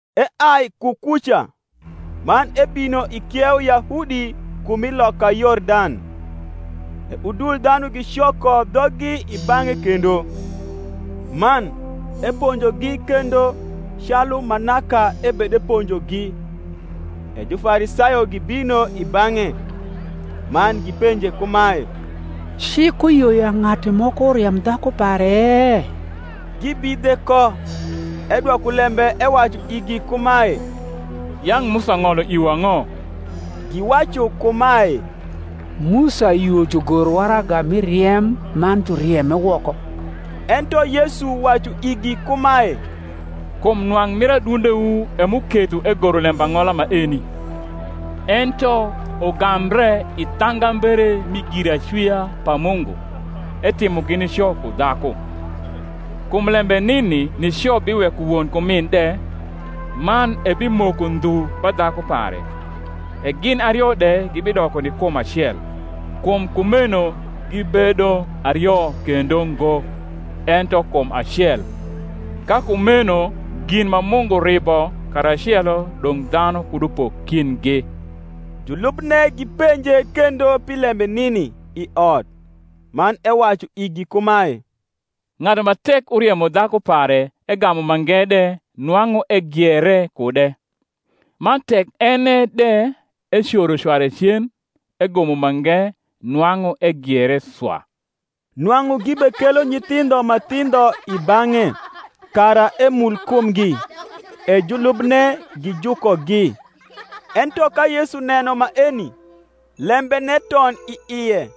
Eai ku kuca, man ebino i kieu Yahudi ku mi loka Yordan: e udul dhanu gicoko dhoggi i bang’e kendo; man, eponjogi kendo calu ma naka ebedepo njogi. E Jufarisayo gibino i bang’e, man gipenje kumae, Cik uyio ya ng’atu moko riem dhaku pare? gibidhe ko. Edwoko lembe ewacu igi kumae, Yang’ Musa ng’olo iwu ang’o? Giwacu kumae, Musa yio jugor waraga mi riem, man jurieme woko. Ento Yesu wacu igi kumae, Kum nwang’ mir adundewu e m’uketho egoro lembang’ola maeni. Ento ugambre i thangambere mi giracwia pa Mungu, etimogi nico ku dhaku. Kum lembe runi nico biweko won ku min de, man ebimoko ndhu ba dhaku pare; e gin ario de gibidoko ni kum acel: kum kumeno gibedo ario kendo ngo, ento kum acel. Ka kumeno gin ma Mungu ribo karacelo dong’ dhanu kud upok kindgi. Julubne gipenje kendo pi lembe nini i ot. Man ewacu igi kumae, Ng’atu ma tek uriemo dhaku pare, egamu mange de, nwang’u egiere kude: man tek enne de ecoro cware cen, egomo mange, nwang’u egiere swa. Nwang’u gibekelo nyithindho ma thindho i bang’e, kara emul kumgi: e julubne gijukogi. Ento ka Yesu neno maeni, lembene ton i ie,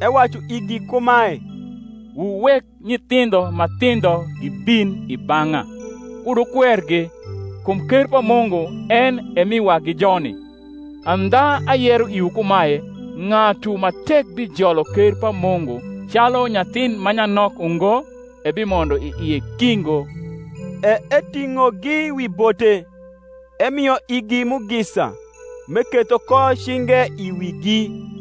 ewacu igi kumae, Wuwek nyithindho ma thindho gibin i bang’a; kud wukwergi: kum ker pa Mungu en e mi wagi joni. Andha ayero iwu kumae, Ng’atu ma tek bijolo ker pa Mungu calu nyathin ma nyanok ungo, ebimondo i ie ki ngo. E eting’ogi wi bote, emio igi mugisa, m’eketho ko cinge i wigi.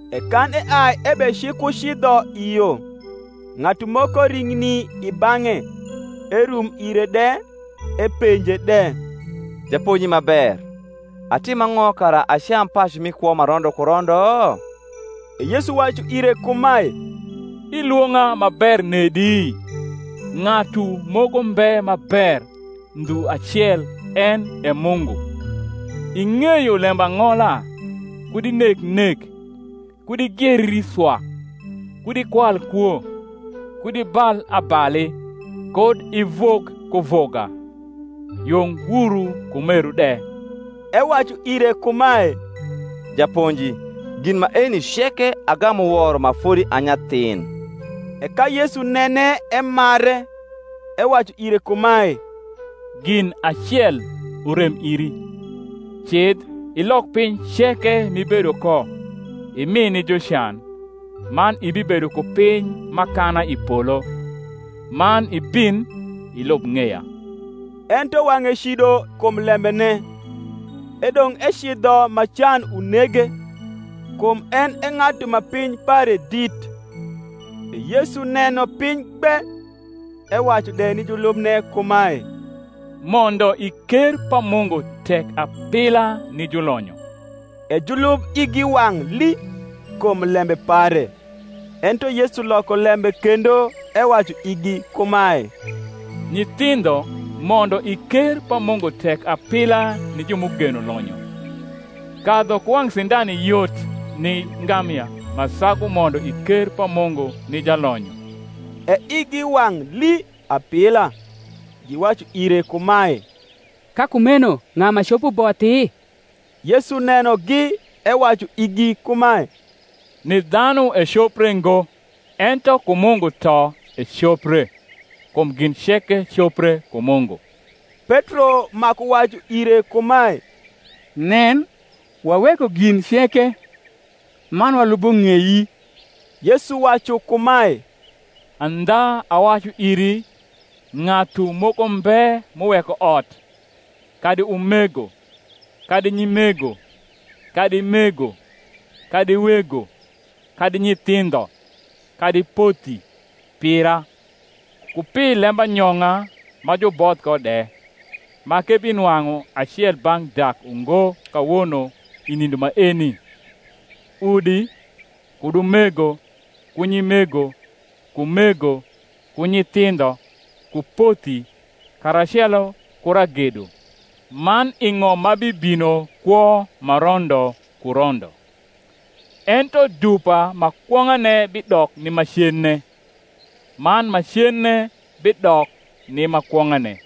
E kan eai ebecikucidho i yo, ng’atu moko ring’ni i bang’e, erum ire de, epenje de, Japonji ma ber, atim ang’o kara acam pacu mi kwo ma rondo ku rondo? E Yesu wacu ire kumae, Ilwong’a ma ber nedi? ng’atu moko mbe ma ber, ndhu acel, en e Mungu. Ing’eyo lembang’ola, Kud ineg nek, Kud igieri swa, kud ikwal kwo, Kud ibal abali, Kud ivug kuvuga, Yung wuru ku meru de. Ewacu ire kumae, Japonji, gin maeni ceke agamu woro ma fodi a nyathin. E ka Yesu nene emare, ewacu ire kumae, Gin acel urem iri: cidh, ilok piny ceke m’ibedo ko, imi ni jucan, man ibibedo ku piny m’akana i polo: man ibin, ilub ng’eya. Ento wang’e cido kum lembene, edong’ ecidho ma can unege: kum en e ng’atu ma piny pare dit. E Yesu neno piny gbe, ewacu de ni julubne kumae, Mondo i ker pa Mungu tek apila ni julonyo! E julub igi wang’ lii kum lembe pare. Ento Yesu loko lembe kendo, ewacu igi kumae, Nyithindho, mondo i ker pa Mungu tek apila ni ju m’ugeno lonyo! Kadhu ku wang’ sindani yot ni ngamia, ma sagu mondo i ker pa Mungu ni jalonyo. E igi wang’ lii apila, giwacu ire kumae, Ka kumeno ng’a ma copo bothi? Yesu nenogi ewacu igi kumae, Ni dhanu ecopre ngo, ento ku Mungu to ecopre: kum gin ceke copre ku Mungu. Petro maku wacu ire kumae, Nen, waweko gin ceke, man walubo ng’ei. Yesu wacu kumae, Andha awacu iri, Ng’atu moko mbe m’uweko ot, kadi umego, kadi nyimego, kadi mego, kadi wego, kadi nyithindho, kadi pothi, pira, ku pi lembanyong’a ma juboth ko de, ma k’ebinwang’u acel bang’ dak ungo kawono i nindo maeni, udi, kud umego, ku nyimego, ku mego, ku nyithindho, ku pothi, karacelo ku ragedo; man i ng’om ma bibino kwo ma rondo ku rondo. Ento dupa ma kwong’ane bidok ni ma cenne; man ma cenne bidok ni ma kwong’ane.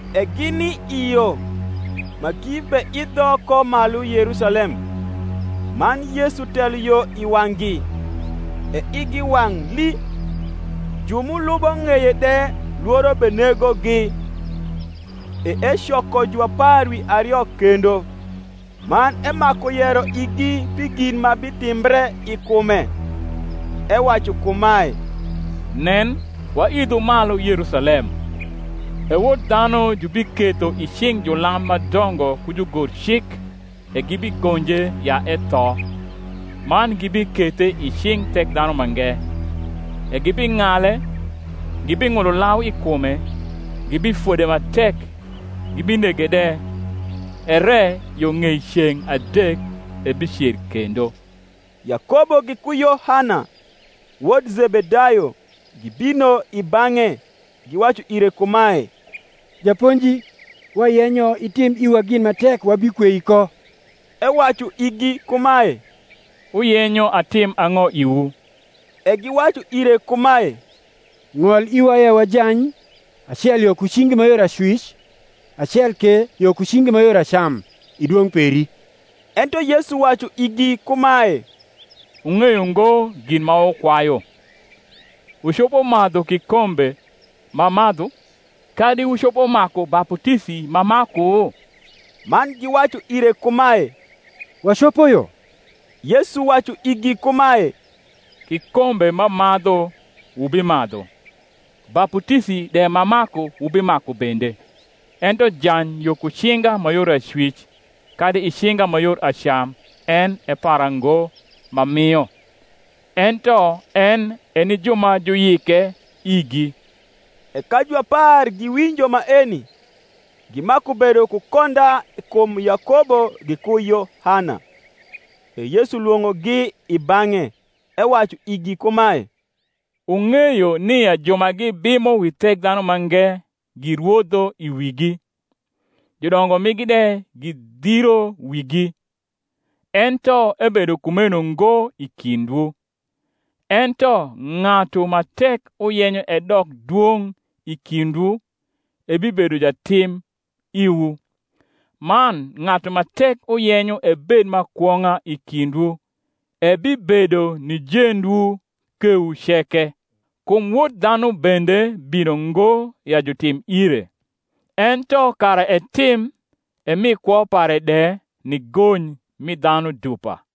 E gini i yo, ma gibeidho ko malu Yerusalem; man Yesu telo yo i wang’gi: e igi wang’ lii; ju m’ulubo ng’eye de lworo benegogi. E ecoko juapar wi ario kendo, man emaku yero igi pi gin ma bitimbre i kume, ewacu kumae, Nen, waidho malu Yerusalem; e Wod dhanu jubiketho i cing’ julam ma dongo ku jugorcik e gibigonje ya etho, man gibikethe i cing’ Thekdhanumange: e gibing’ale, gibing’ulo lau i kume, gibifode ma tek, gibinege de; ere yo ng’ei ceng’ adek ebicer kendo. Yakobo giku Yohana, wot Zebedayo, gibino i bang’e, giwacu ire kumae, Japonji, wayenyo itim iwa gin ma tek wabikwei ko. Ewacu igi kumae, Wuyenyo atim ang’o iwu? E giwacu ire kumae, Ng’ol iwa ya wajany, acel yo ku cingi ma yor acwic, acel ke yo ku cingi ma yor acam, i dwong’ peri. Ento Yesu wacu igi kumae, Wung’eyo ngo gin ma wukwayu. Wucopo madhu krkombe m’amadhu? kadi wucopo maku baputisi m’amaku? Man giwacu ire kumae, Wacopo yo. Yesu wacu igi kumae, Kikombe m’amadhu wubimadhu; baputisi de m’amaku wubimaku bende: ento jany yo ku cinga ma yor acwic kadi i cinga ma yor acam en e para ngo m’amio; ento en e ni ju ma juyike igi. E ka juapar giwinjo maeni, gimaku bedo ku konda kum Yakobo giku Yohana. E Yesu lwong’ogi i bang’e, ewacu igi kumae, Wung’eyo nia ju ma gibimo wi Thekdhanumange girwodho i wigi; judongo migi de gidhiro wigi. Ento ebedo kumeno ngo i kindwu: ento ng’atu ma tek uyenyo edok dwong’ i kindwu, ebibedo jatim iwu; man ng’atu ma tek uyenyo ebed ma kwong’a i kindwu, ebibedo ni jendwu kewu ceke. Kum Wod dhanu bende bino ngo ya jutim ire, ento kara etim, emi kwo pare de ni gony mi dhanu dupa.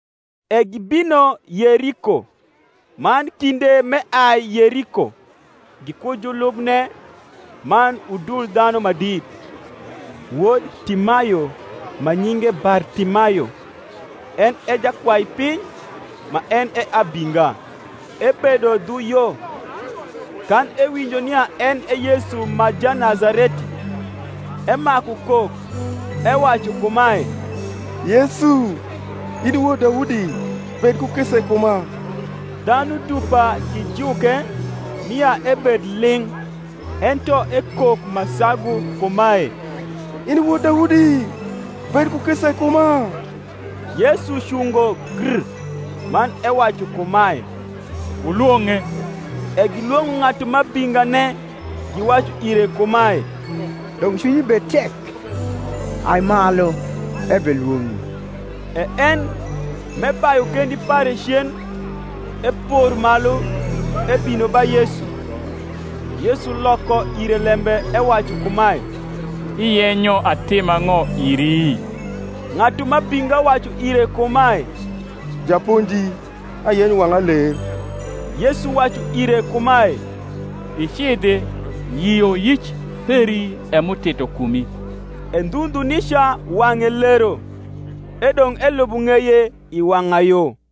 E gibino Yeriko: man kinde m’eai Yeriko, giku julubne man udul dhanu ma dit, wod Timayo, ma nyinge Bartimayo, en e jakwaipiny ma en e abinga, ebedo dhu yo. Kan ewinjo nia en e Yesu ma Janazareti, emaku kok, ewacu kumae, Yesu, in i wod Daudi, bed ku kisa i kuma. Dhanu dupa gijuke, nia ebed ling’: ento ekok ma sagu kumae, In i wod Daudi, bed ku kisa i kuma. Yesu cungo gr, man ewacu kumae, Wulwong’e. E gilwong’o ng’atu m’abingane, giwacu ire kumae, Dong’ cwinyi bed tek: ai malu, ebelwong’i. E en, m’ebayu kendi pare cen, epor malu, ebino ba Yesu. Yesu loko ire lembe, ewacu kumae, Iyenyo atim ang’o iri? Ng’atu m’abinga wacu ire kumae, Japonji, ayenyo wang’a ler. Yesu wacu ire kumae, Icidhi; yioyic peri e m’utito kumi. E ndhu ndhu nica wang’e lero, edong’ elubo ng’eye i wang’ayo.